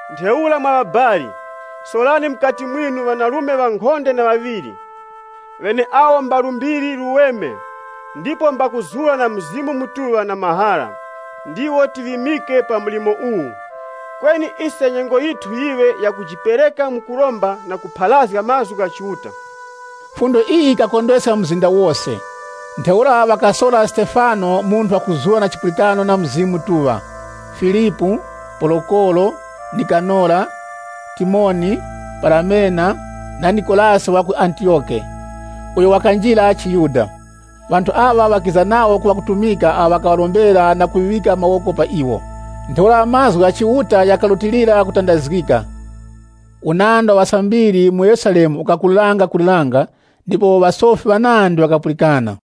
Ntheura mwa ŵabali, sorani mukati mwinu ŵanarume ŵankhonde na ŵaŵiri, ŵeneawo mba lumbiri luweme, ndipo mbakuzura na Mzimu Mutuŵa na mahara, ndiwo tiŵimike pa mlimo uwu. Kweni ise nyengo yithu yiŵe yakujipereka mu kuromba na mu kupharazga mazgu gha Chiuta.” Fundo iyi yikakondweska mzinda wose. Ntheura ŵakasora Stefano, munthu wakuzura na chipulikano na Mzimu Mutuŵa, Filipu, Porokoro, Nikanora, Timoni, Paramena, na Nikolasi wa ku Antiyoke, uyo wakarondezga chiYuda. Ŵanthu aŵa ŵakiza nawo ku ŵakutumika awo ŵakaŵarombera na kuŵika mawoko pa iwo. Ntheura mazgu gha Chiuta ghakarutilira kutandazgika. Unandi wa ŵasambiri mu Yerusalemu ukakulirangakuliranga, ndipo ŵasofi ŵanandi ŵakapulikana.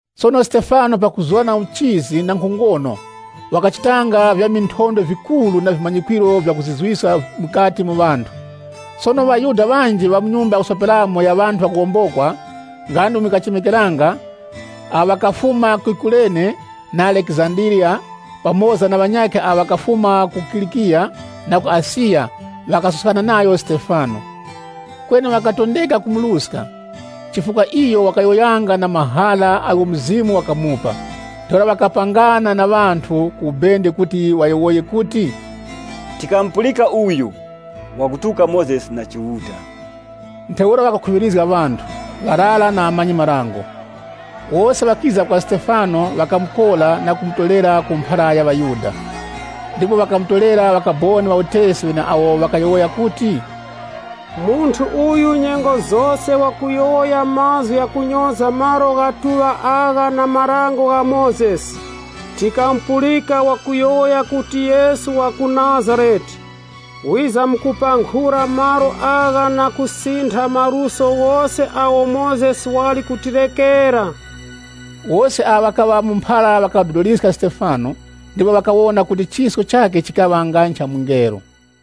Sono Stefano pakuzura na uchizi na nkhongono, wakachitanga vya minthondwe vikuru na vimanyikwiro vyakuzizwiska mukati mu ŵanthu. Sono ŵaYuda ŵanji ŵa mu nyumba ya kusoperamo ya ŵanthu ŵakuwombokwa (nga ndi umo yikachemekeranga), awo ŵakafuma ku Kurene na Alekizandiriya pamoza na ŵanyakhe awo ŵakafuma ku Kilikiya na ku Asiya, ŵakasuskana nayo Stefano. Kweni ŵakatondeka kumuruska, chifukwa iyo wakayowoyanga na mahara agho Mzimu wakamupa. Ntheura ŵakapangana na ŵanthu ku ubende kuti ŵayowoye kuti, “Tikamupulika uyu wakutuka Mozesi na Chiuta.” Ntheura ŵakakhuŵirizga ŵanthu, ŵarara na ŵamanyi-marango. Wose ŵakiza kwa Stefano, ŵakamukora na kumutorera ku mphara ya ŵaYuda. Ndipo ŵakamutorera ŵakaboni ŵa utesi ŵeneawo ŵakayowoya kuti, “Munthu uyu nyengo zose wakuyowoya mazgu gha kunyoza Nyumba ya Chiuta agha na Dango la Mozesi.” Tikamupulika wakuyowoya kuti Yesu wa ku Nazarete wizamkupankhura malo agha na kusintha maluso ghose agho Mozesi wali kutirekera! Wose awo ŵakaŵa mu mphara ŵakadodoliska Stefano, ndipo ŵakawona kuti chisko chakhe chikaŵa nga ncha mungelo.